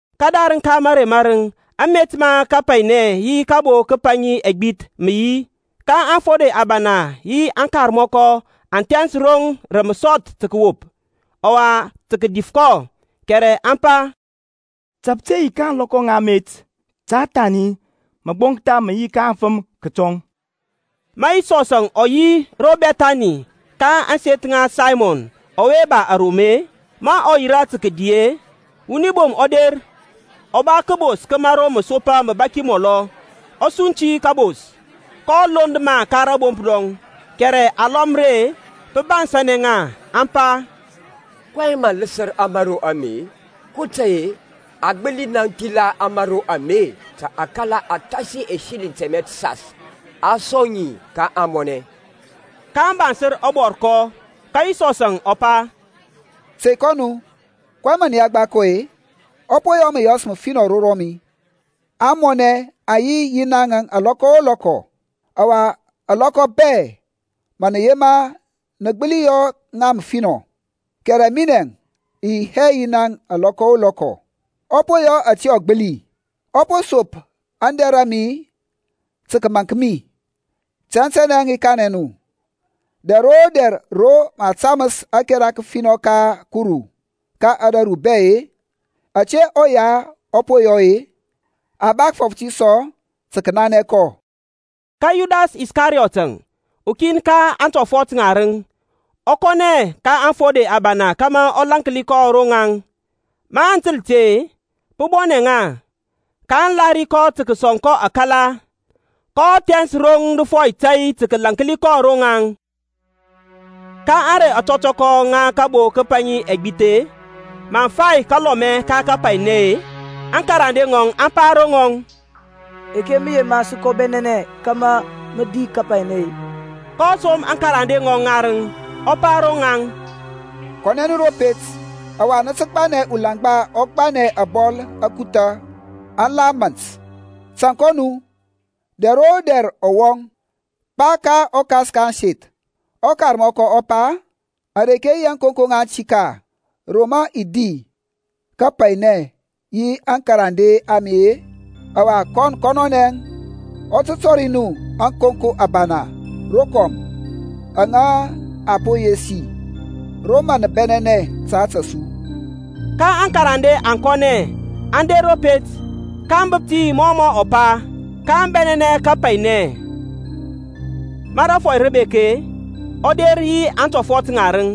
Kədarəŋ ka mərey mȧrəŋ amet ma kapainɛ yi kabo kəpaŋi ɛgbith mə yi, ka aŋfode abana yi aŋkarmɔkɔ aŋ thɛns roŋ rə məsɔth tə kəwop, ɔwa tə kədif kɔ; kɛrɛ aŋ pa, Ta pə te yi ka ȧŋlɔkɔ ŋa amet ta kəthɛna məgboŋktha mə yi ka aŋfəm kətɔŋ. Ma Yisɔs ɔ yi ro Bɛthani ka ȧŋseth ŋa Saymɔn ɔwe ba arom-e, ma ɔ yirȧ tə kədi-e, wuni bom ɔ der ɔ ba kəbos ka mȧro məsopa məbaki mɔlɔ. Ɔ sunti kȧbos, kɔ lond ma ka rȧbomp rɔŋ. Kɛrɛ alɔm ri-e, pə bansȧnɛ ŋa, aŋ pa, kɔyɛŋ mɔ ləsər ȧmȧro ame-e? kotȧy-e a gbəli naŋ thila ȧmȧro ame ta akala athasi ɛsiliŋ tɛmɛ təsas, a sɔŋ ma ka ȧŋmɔnɛ. Kaŋ bansər ɔbɔrkɔ. Ka Yisɔsȧŋ ɔ pa, Tey kɔ nu. Kɔyɛŋ mə kira kɔ-e? Ɔ po yɔ məyɔs məfinɔ ro rɔmi. Aŋmɔnɛ aŋ yi yi naŋȧŋ alɔkɔ o lɔkɔ, ɔwa alɔkɔ bɛ ma nə yema nə gbəli yɔ ŋa ɔfinɔ. Kɛrɛ minɛŋ i yi hɛ yi naŋȧŋ lɔkɔ o lɔkɔ. Ɔ po yɔ ȧte ɔ gbəli; ɔ po sop aŋdɛr a mi tə kəmȧnk mi. Tɛntɛnɛ i kanɛ nu, Dɛr o dɛr ro mə a taməs ȧkɛra kəfinɔ ka Kuru ka ȧdȧru bɛ-e, ȧte ɔya ɔ po yɔ-e, a ba kəfɔf ti sɔ tə kənanɛ kɔ. Ka Yudas Iskariyɔtȧŋ, ukin ka aŋtɔfɔt ŋarəŋ, ɔ kɔnɛ ka aŋfode abana kȧmȧ ɔ lȧnki kɔ ro rɔŋaŋ. Maŋ təl ti-e, pə bɔnɛ ŋa, kaŋ lahiri tə kəsɔŋ kɔ akala. Kɔ thɛns roŋ dəfɔy tȧy tə kəlaŋkli kɔ ro ŋaŋ. Ka ȧŋrey ȧtɔtɔkɔ ŋa kabo kəpaŋi ɛgbith-e, maŋ fai kalɔmɛ ka kapainɛ-e, aŋkarande ŋɔŋ aŋ pa ro ŋɔŋ, Reke mə yema sə kɔ bɛnɛnɛ kȧmȧ mə di kapainɛ-e? kɔ som akarande ŋɔŋ ŋarəŋ, ɔ pa ro rɔŋaŋ, Kɔnɛ nu ro pet, ɔwa nə tə gbanɛ ulaŋgba ɔ gbanɛ ȧbɔl ȧkuthȧ aŋ la mȧnt; tȧŋ kɔ nu. Dɛr o dɛr ɔ wɔŋ, pa ka ɔkas ka ȧŋseth, Ɔkarmɔkɔ ɔ pa, Areke yi ȧŋkonko ŋa aŋtik-a, ro mə i di kapainɛ yi aŋkarande a mi-e? Ɔwa kɔn kɔnɔnɛ ɔ tə tɔri nu ȧkonko abana rokɔm aŋa a po yesi ro mə nə bɛnɛnɛ ta ȧtȧ su. Ka aŋkarande aŋ kɔnɛ aŋ der ro pet, kaŋ bəp ti mɔ mɔ pa, kaŋ bɛnɛnɛ kapainɛ. Ma rȧfɔy rə bek-e, ɔ der yi aŋtɔfɔt ŋarəŋ.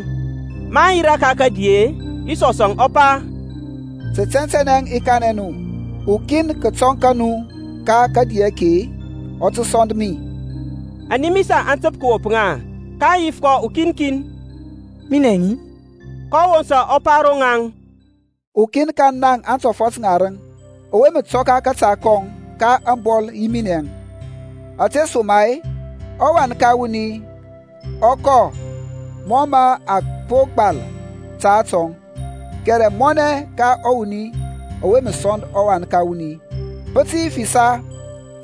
Maŋ yirȧ ka kədi-e, Yisɔsȧŋ ɔ pa, Tə tɛntɛnɛ i kanɛ nu, ukin kətɔŋ ka nu ka kadi ake-e ɔ tə sɔnd mi. Animisa aŋ təp kəwop ŋa, kaŋ yif kɔ ukin kin, Minɛŋ-i? kɔ wosa ɔ pa ro rɔŋaŋ, Ukin ka na atɔfɔt ŋarəŋ, ɔwe mə tɔka kȧta kɔŋ ka ȧŋbɔl yi minɛŋ. Ȧtesoma-e ɔWan ka wuni ɔ kɔ mɔ mə a po gbal ta atɔŋ; kɛrɛ mɔnɛ ka ɔwuni ɔwe mə sɔnd ɔWan ka wuni! Pə tə yi ɔfinɔ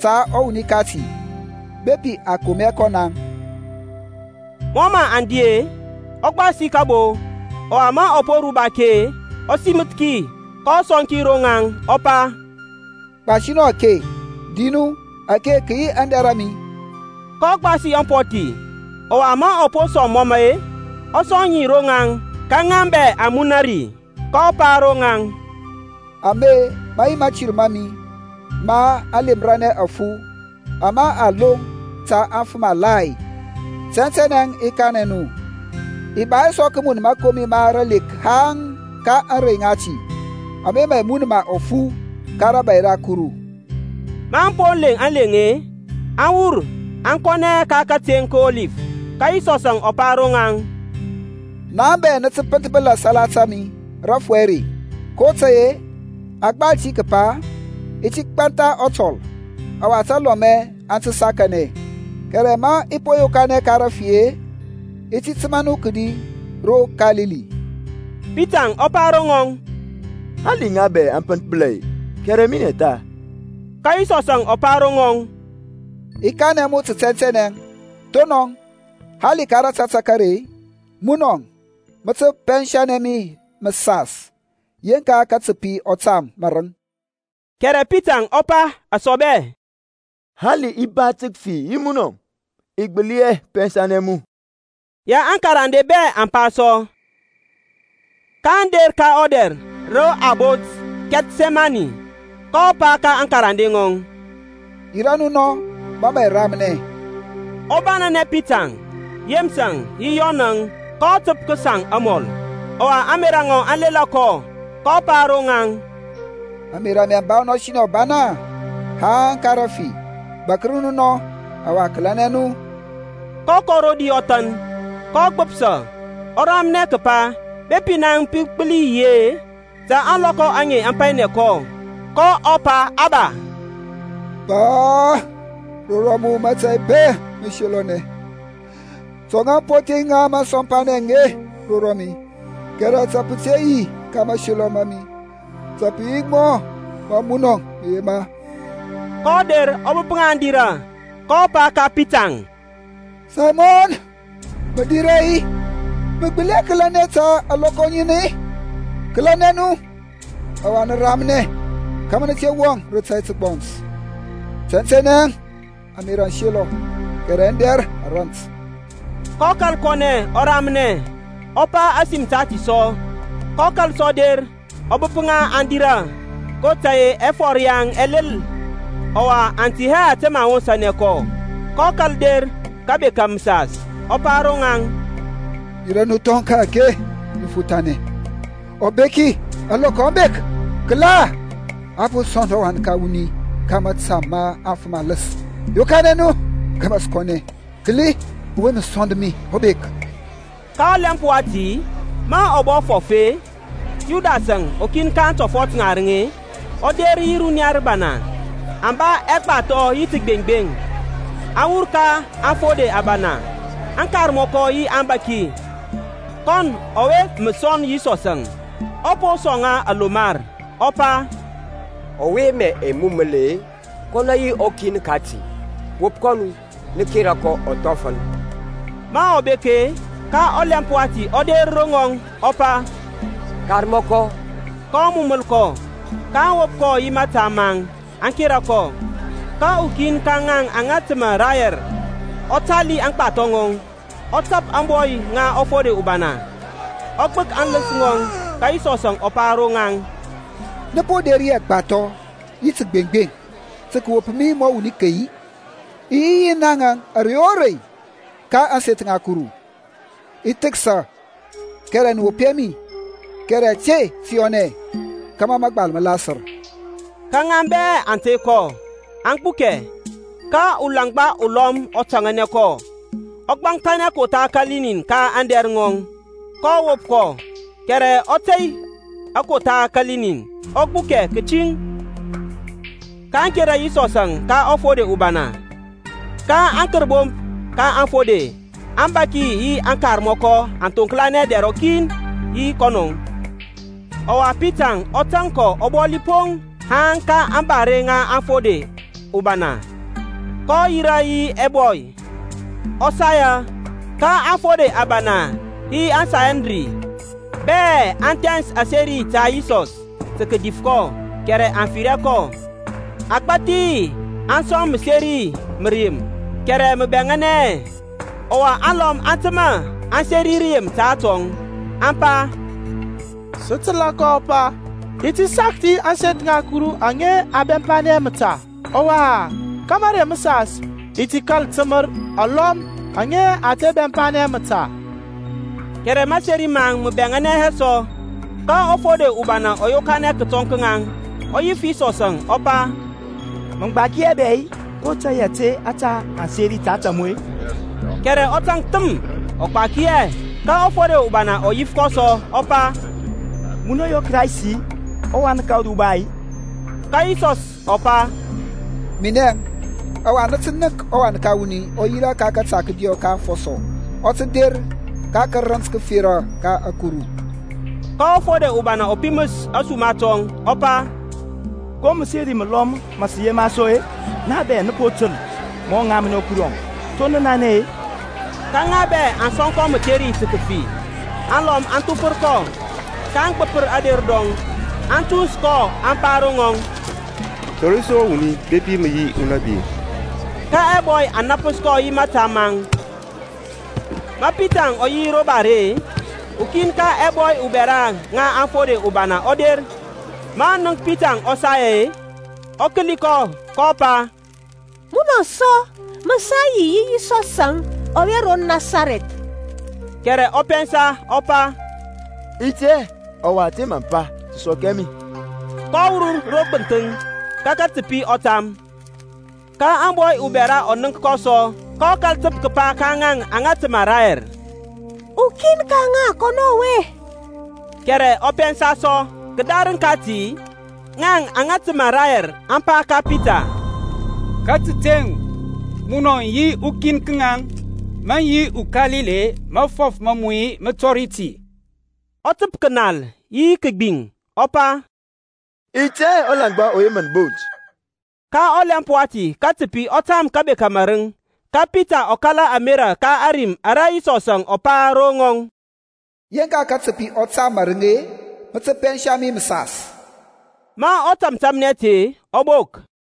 ta ɔwuni kati bepi a kom hɛ kɔ naŋ. Mɔ mə aŋ di-e, ɔ gbasi kabo, ɔwa ma ɔ po ruba ki-e, ɔ siməth ki, kɔ sɔŋ ki ro rɔŋaŋ, ɔ pa, Gbasi nu ake, nə di. Ake kə yi aŋdɛr a mi. kɔ gbasi ampɔthi, ɔwa ma ɔ po sɔŋ məmə-e, ɔ sɔŋ ŋi ro ŋaŋ, ka ŋa bɛ aŋ muna ri. kɔ pa ro ŋaŋ, Ame mə yi mȧtir ma mi ma aŋlemranɛ afu ama a loŋ ta afəm alai. Tɛntɛnɛ i kanɛ nu, i ba hɛ sɔ kəmun mȧkomi ma ralek haŋ ka ȧŋrey ŋati aŋa mə i mun ma ɔfu ka rȧbȧy ra Kuru. Maŋ po leŋ aleŋ-e, aŋ wur aŋ kɔnɛ ka kateŋ ka Ɔlif. Ka Yisɔsȧŋ ɔ pa ro ŋaŋ, Naŋ bɛ nə tə pənthbəla salata mi rȧfɔy are; kotȧy-e a gbal ti kəpa, I ti gbantha ɔtɔl, ɔwa talɔmɛ aŋ tə sakanɛ. Kɛrɛ ma i po yokanɛ ka rafi-e, i ti təmȧ nu kədi ro Kalili. Pitaŋ ɔ pa ro ŋɔŋ, Hali ŋa bɛ aŋ pənthbəla-e, kɛrɛ minɛ tha. Ka Yisɔs ɔ pa ro ŋɔŋ, I kanɛ mu tə tɛntɛnɛ, thonɔŋ, hali ka rȧtȧtȧk are-e, munɔ mə tə pɛnsanɛ mi məsas, yeŋka katəpi ɔ tam mȧrəŋ. Kɛrɛ Pitaŋ ɔ pa asɔbɛ, Hali i ba tə kəfi yi munɔŋ, i gbəli hɛ pɛnsanɛ mu. Ya aŋkarande bɛ aŋ pa sɔ. kaŋ der ka ɔdɛr ro a bont Kɛthsɛmanɛ; kɔ pa ka aŋkarande ŋɔŋ, Yirȧ nu nɔ ma mə i ramnɛ. Ɔ banɛnɛ Pitaŋ, Yeməs yi Yɔnȧŋ kɔ təp kəsaŋ amɔl, ɔwa ȧŋmerȧ ŋɔŋ aŋ lela kɔ. kɔ pa ro ŋaŋ, Ȧŋmerȧ a mi aŋ ba ɔnɔsinɛ ɔbana haŋ ka rəfi. Bȧkər nu nɔ, ɔwa kəlɛnɛ nu. kɔ kɔ rodi ɔthan, kɔ gbəpsa, ɔ ramnɛ kəpa bepi naŋ pə gbəli yi-e ta ȧŋlɔkɔ aŋe aŋ painɛ kɔ. kɔ pa Aba, Pa, ro rɔmu mȧtȧy bɛ mə selɔnɛ. Tɔŋa ampɔthi ŋa ȧŋsɔmpanɛŋ aŋe ro mi, kɛrɛ ta pə te yi ka mayema ma mi, ta pə yi mɔ mə munɔ mə yema. kɔ der ɔ bəp ŋa aŋ dirȧ, kɔ pa ka Pitaŋ, Saymɔn, mə dira-i, mə gbəli hɛ kəlɛnɛ ta alɔkɔ ŋin-i? Kəlȧnɛ nu ɔwa nə ramnɛ kȧmȧ nə te wɔŋ rə tȧy təgbɔns. Tɛntɛnɛ ȧŋmerȧ aŋ selɔ kɛrɛ aŋdɛr a rant. kɔ kȧl kɔnɛ ɔ ramnɛ, ɔ pa ȧsim tati sɔ. kɔ kȧl sɔ der, ɔ bəp ŋa aŋ dirȧ, kotȧy-e ɛfɔr yaŋ ɛ lel; ɔwa aŋ tɛ hɛ ȧte mə aŋ wosȧnɛ kɔ. kɔ kȧl der kəbeka məsas, ɔ pa ro ŋaŋ, Dira nu thɔŋ ka-ake, nə fothanɛ. Ɔbeki, ȧŋlɔkɔ aŋ bek. Kəla, a po sɔnd ɔWan ka wuni ka mȧta ma afəm aləs. Yokanɛ nu kȧmȧ sə kɔnɛ. Kəli, ɔwe mə sɔnd mi ɔ bek. Ka ɔlɛmp wati, ma ɔ bɔ fɔf-e, Yudasȧŋ, ukin ka aŋtɔfɔt ŋarəŋ-e, ɔ der yi runiya rəbana, aŋ ba ɛgbathɔ yi təgbeŋgbeŋ, aŋ wur ka aŋfode abana, aŋkarmɔkɔ yi aŋbȧki. Kɔn ɔwe mə sɔnd Yisɔsȧŋ ɔ po sɔŋ ŋa alomar, ɔ pa, Ɔwe mə i muməl-e, kɔnɔ yi ɔkin kati. Wop kɔ nu, nə kera kɔ ɔthɔfəl. Ma ɔ bek-e, ka ɔlɛmp wati ɔ der ro ŋɔŋ ɔ pa, Karmɔkɔ, Karmɔkɔ; kɔ muməl kɔ. kaŋ wop kɔ yi tȧmthədɛrəŋ maŋ, aŋ kera kɔ. Ka ukin ka ŋaŋ aŋa təmȧ rayɛr ɔ tali aŋgbathɔ ŋɔŋ, ɔ tap ȧŋbɔy ŋa ɔfode ubana, ɔ gbək aŋləns ŋɔŋ. Ka Yisɔs ɔ pa ro ŋaŋ, Nə po der yi ɛgbathɔ dɛ yi təgbeŋgbeŋ tə kəwop mi mɔ wuni key-i? I yi yi naŋȧŋ ȧrey o rei ka ȧŋseth ŋa Kuru, i thəksa, kɛrɛ nə wop hɛ mi. Kɛrɛ ȧte tə yɔnɛ kȧmȧ mȧgbal mə lasər. Ka ŋa bɛ aŋ tey kɔ, aŋ gbukɛ. Ka ulaŋgba ulɔm ɔ taŋanɛ kɔ, ɔ gbaŋkthanɛ kotha kəlinɛn ka aŋdɛr ŋɔŋ, ka a wop kɔ. Kɛrɛ ɔ tey akotha kəlinɛn, ɔ gbukɛ kətiŋ. kaŋ kera Yisɔsȧŋ ka ɔfode ubana. Ka aŋkərbomp ka aŋfode, aŋbȧki yi aŋkarmɔkɔ aŋ thoŋklanɛ dɛr rɔkin yi kɔnɔ. Ɔwa Pitaŋ ɔ tȧŋ kɔ ɔbɔli poŋ haŋ ka ȧŋbare ŋa ɔfode ubana. Kɔ yirȧ yi ɛbɔy, ɔ saya. Ka aŋfode abana yi aŋSanhedrin bɛ aŋ thɛns aseri ta Yisɔsȧŋ tə kədif kɔ kɛrɛ aŋ fir hɛ kɔ. Agbathi aŋ sɔŋ məseri ma rəyem, kɛrɛ mə bɛŋȧnɛ hɛ. Ɔwa alɔm aŋ təmȧ aŋ seri rəyem ta atɔŋ, aŋ pa, Sə təlȧ kɔ ɔ pa, I ti sakthi ȧŋseth ŋa Kuru aŋe aŋa a bɛmpanɛ məta, ɔwa ka mərey məsas i ti kȧl təmər alɔm aŋa a te bɛmpanɛ məta. Kɛrɛ maseri maŋ mə bɛŋȧnɛ hɛ sɔ. Ka ɔfode ubana ɔ yokanɛ kətɔŋ ka ŋaŋ, ɔ yif Yisɔsȧŋ, ɔ pa, Mə gbaki hɛ bɛ-i? Ko tȧy ȧte ȧtȧ aŋ seri ta ȧtȧ mu-e? Kɛrɛ ɔ taŋk thəm, ɔ gbaki hɛ. Ka ɔfode ubana ɔ yif kɔ sɔ, ɔ pa, Munɔ yi ɔKraist-i, ɔWan ka ɔRuba-i? Ka Yisɔs ɔ pa, Minɛŋ, ɔwa nə tə nənk ɔWan ka wuni ɔ yirȧ ka kȧta kədiɔ ka afɔsɔ, ɔ tə der ka tarənt təfera ta ȧkuru. Ka ɔfode ubana ɔ piməs ȧsuma tɔŋ, ɔ pa, Ko məseri məlɔm mə sə yema sɔ-e? Na bɛ nə po təl ma ɔ ŋamnɛ Kurɔŋ. To nə nanɛ-e? Ka ŋa bɛ aŋ sɔŋ kɔ mətheri tə kəfi. Alɔm aŋ thufər kɔ, kaŋ gbəpər ader rɔŋ, aŋ tuns kɔ, aŋ pa ro ŋɔŋ, Tɔri su ɔwuni bepi mə yi unȧbi. Ka ɛbɔy aŋ nȧpəs kɔ yi mȧta maŋ. Ma Pitaŋ ɔ yi ro bare-e, ukin ka ɛbɔy abɛra ŋa ɔfode ubana ɔ der. Ma ɔ nənk Pitaŋ ɔ saya-e, ɔ kəli kɔ kɔ pa, Munɔ sɔ mə sa yi yi Yisɔsȧŋ ɔwe ro Nasarɛth. Kɛrɛ ɔ pɛnsa ɔ pa, I tɛ hɛ, ɔwa ȧte mə pa tə sɔk hɛ mi. Kɔ wur ro gbənthəŋ, ka katəpi ɔ tam. Ka ȧbɔy ubɛra ɔ nənk kɔ sɔ, kɔ kȧl təp kəpa ka ŋaŋ aŋa təmȧ rayɛr, Ukin ka ŋaŋ kɔnɔ ɔwe. Kɛrɛ ɔ pɛnsa sɔ. Kədarəŋ kati ŋaŋ aŋa təmȧ rayɛr aŋ pa ka Pita, Ka təteŋ munɔ yi ukin ka ŋaŋ, mə yi uKalili, mafɔf ma mu mə tɔri ti. Ɔ təp kənal yi kəgbiŋ, ɔ pa, I tɛ hɛ ɔlaŋgba ɔwe mə nə bont. Ka ɔlɛmp wati katəpi ɔ tam kəbeka mȧrəŋ. Ka Pita ɔ kala ȧmerȧ ka ȧrim ara Yisɔs ɔ pa ro rɔŋɔŋ, Yeŋka katəpi ɔ tam marəŋ-e, mə tə pɛnsa mi məsas. Ma ɔ tȧmtȧmnɛ ti-e, ɔ bok.